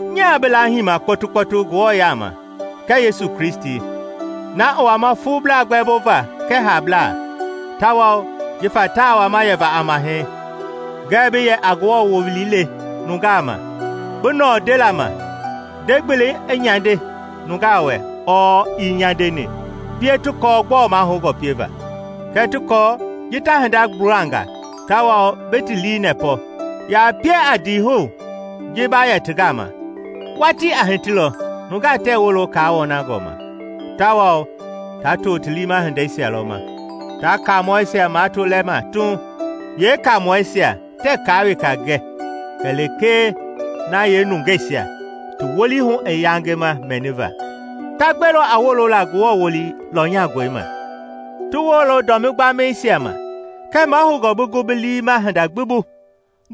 Nyaa bi laahima kpɔtukpɔtu Ngewɔ yaama kɛɛ Yesu Kristi, na i wama fuublaa gbɛmbova kɛɛ haablaa, tawao jifa taa wama yɛva a Mahɛi, ngɛɛ bi yɛ a Ngewɔ wowili le nungaa ma, bi nɔɔ ndela ma; nde-gbelei i nyande nungaa wɛ ɔɔ ii nyandeni, pie ti kɔɔ gbɔɔ mahoungɔ pieva, kɛɛ ti kɔɔ ji ta hinda gbulanga tawao bi ti lii nɛpɔ, ya pie a ndiihou ji ba yɛ ti gama. Watii a hitilɔ nungaa tɛɛ wolo kaa wɔnangɔ ma, tawao ta to ti liima hindeisia lɔ ma, ta kaamɔisia mato lɛma tuuŋ, yeekaamɔɛisia tɛɛ kaa weka gɛ kɛlee na yeenungeisia ti wolii hu i yangema mɛniva. Ta gbelɔ a wolola Ngewɔ wowili lɔnyangɔi ma, ti wolo dɔmi gbamɛisia ma. Kɛɛ mahoungɔ bi gu bi lii ma hinda gbi hu;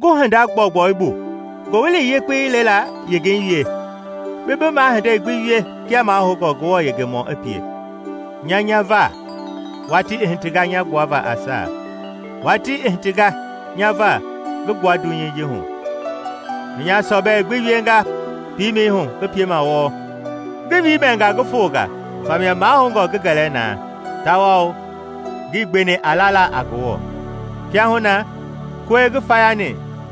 gu hinda gbɔugbɔu bu, Ngowili Yekpei lela yengei wie, bi bi mahindei gbi wie kia mahoungɔ Ngewɔ yengemɔɔ i pie. Nya nya va, watii i hitinga nya gbuava a saa; watii i hitinga nya va ngi gbua dunyei ji hu. Ngi nya sɔbɛi gbi wienga piimɛi hu ngi piema wɔɔ, ngi wiimɛnga ngi fonga famia mahoungɔ ngi gɛlɛ na, tawao ngii gbeni a lala a Ngewɔ. Kiahuna na kɔi ngi fayani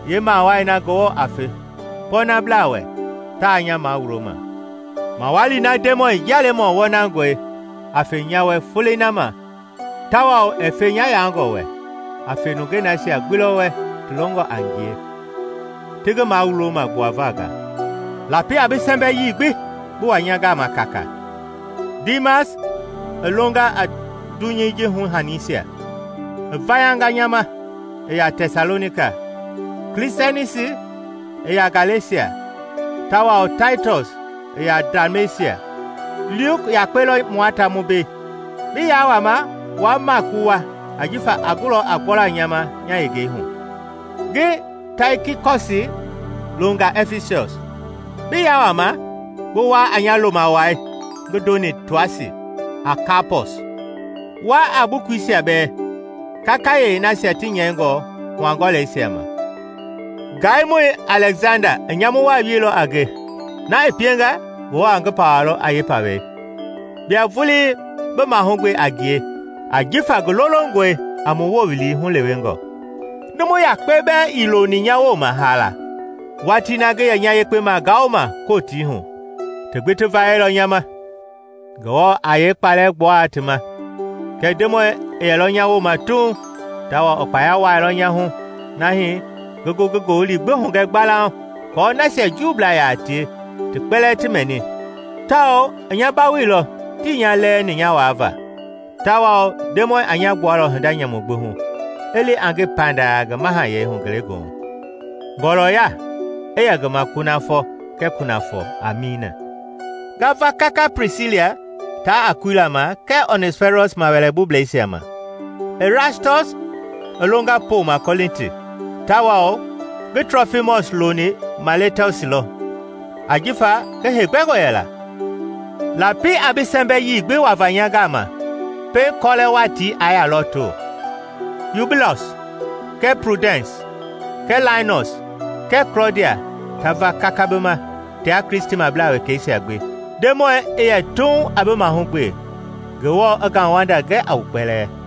yeemawai na Ngewɔ a fe pɔɔnablaa wɛ taa nya mawuloma, mawali na Ndemɔi, Njialemɔ wɔnangɔi, a fe nya wɛ Folei na ma tawao ɛɛ fe nya yaangɔ wɛ, a fe nungei nasia gbi lɔ wɛ ti longɔ a ngie, ti ngi mawuloma gbuava nga. Lapi a bi sɛmbɛi yii gbi bi wa nya gama kaakaa. Diimas i longa a dunyɛi ji hu-haniisia, i vayanga nya ma i ya Tɛsalonika. Klisɛnsi i ya Galesia, tawao Taitɔs i ya Dalmesia. Luki yakpe lɔ mua ta mu mbei. Bi yaa wama wua Maaki wu wa ajifa a gulɔ a gbɔla nya ma nya yengei hu. Ngi Taikikɔsi longa Ɛfisɔs. Bi yaa wama bi wa a nya lomawai ngi ndoni Toasi a Kaapɔs; wa a bukuisia bɛɛ, kakayee yeenasia ti nyɛingɔ hua-kɔlɛisia ma. Ngaimɔi Alɛksanda i nyamu waa wieilɔ a nge; na i pienga Ngewɔ a ngi pawalɔ a yeepawei. Bia vulii bi mahugbe a ngie ajifa ngi lolongɔe a mu wowili hulewengɔ. Numu yakpe bɛɛ ii loni nya wooma haala watii na ngi yɛ nya yekpe magaoma Kotii hu; ti gbi ti vayɛilɔ nya ma. Ngewɔ aa yeekpalɛ gbua ti ma! Kɛɛ Ndemɔi i yɛlɔ nya wooma tuuŋ tawao i kpaya wuailɔ nya hu nahi ngi gu ngi ngowili gbi hugɛ gbalauŋ aako nasia Juublaa yaa tie ti kpɛlɛɛ ti mɛni; tawao i nya bawoilɔ tii nya lɛɛni nya waava. Tawao Ndemɔi a nya gbualɔ hinda nyamu gbi hu, i li a nge panda ngi Mahayɛi hu ngelegoohu. Ngɔɔlɔya i yɛ ngi ma kunafɔ kɛɛ kunafɔ! Amiina. Nga va kaka Plisila taa Akuila ma kɛɛ Onɛsiforɔs mawɛlɛbublɛisia. Irastɔs i longa poma Kɔlinti tawao ngi Trofimɔs loni Mailetɔsi lɔ jifa ngi heegbɛngɔ yɛla. Lapi a bi sɛmbɛ yii gbi wava nya gama pɛiŋ kɔlɛ watii i yaa lɔto. Yubiulɔs, kɛɛ Piudɛns, kɛɛ Lainɔs kɛɛ Klɔdia ta va kaka bi ma tia Kristimablaa wekɛisia gbi. Ndemɔi i yɛ tuuŋ a bi mahugbe. Ngewɔ i ngauwanda gɛ a wu kpɛlɛɛ.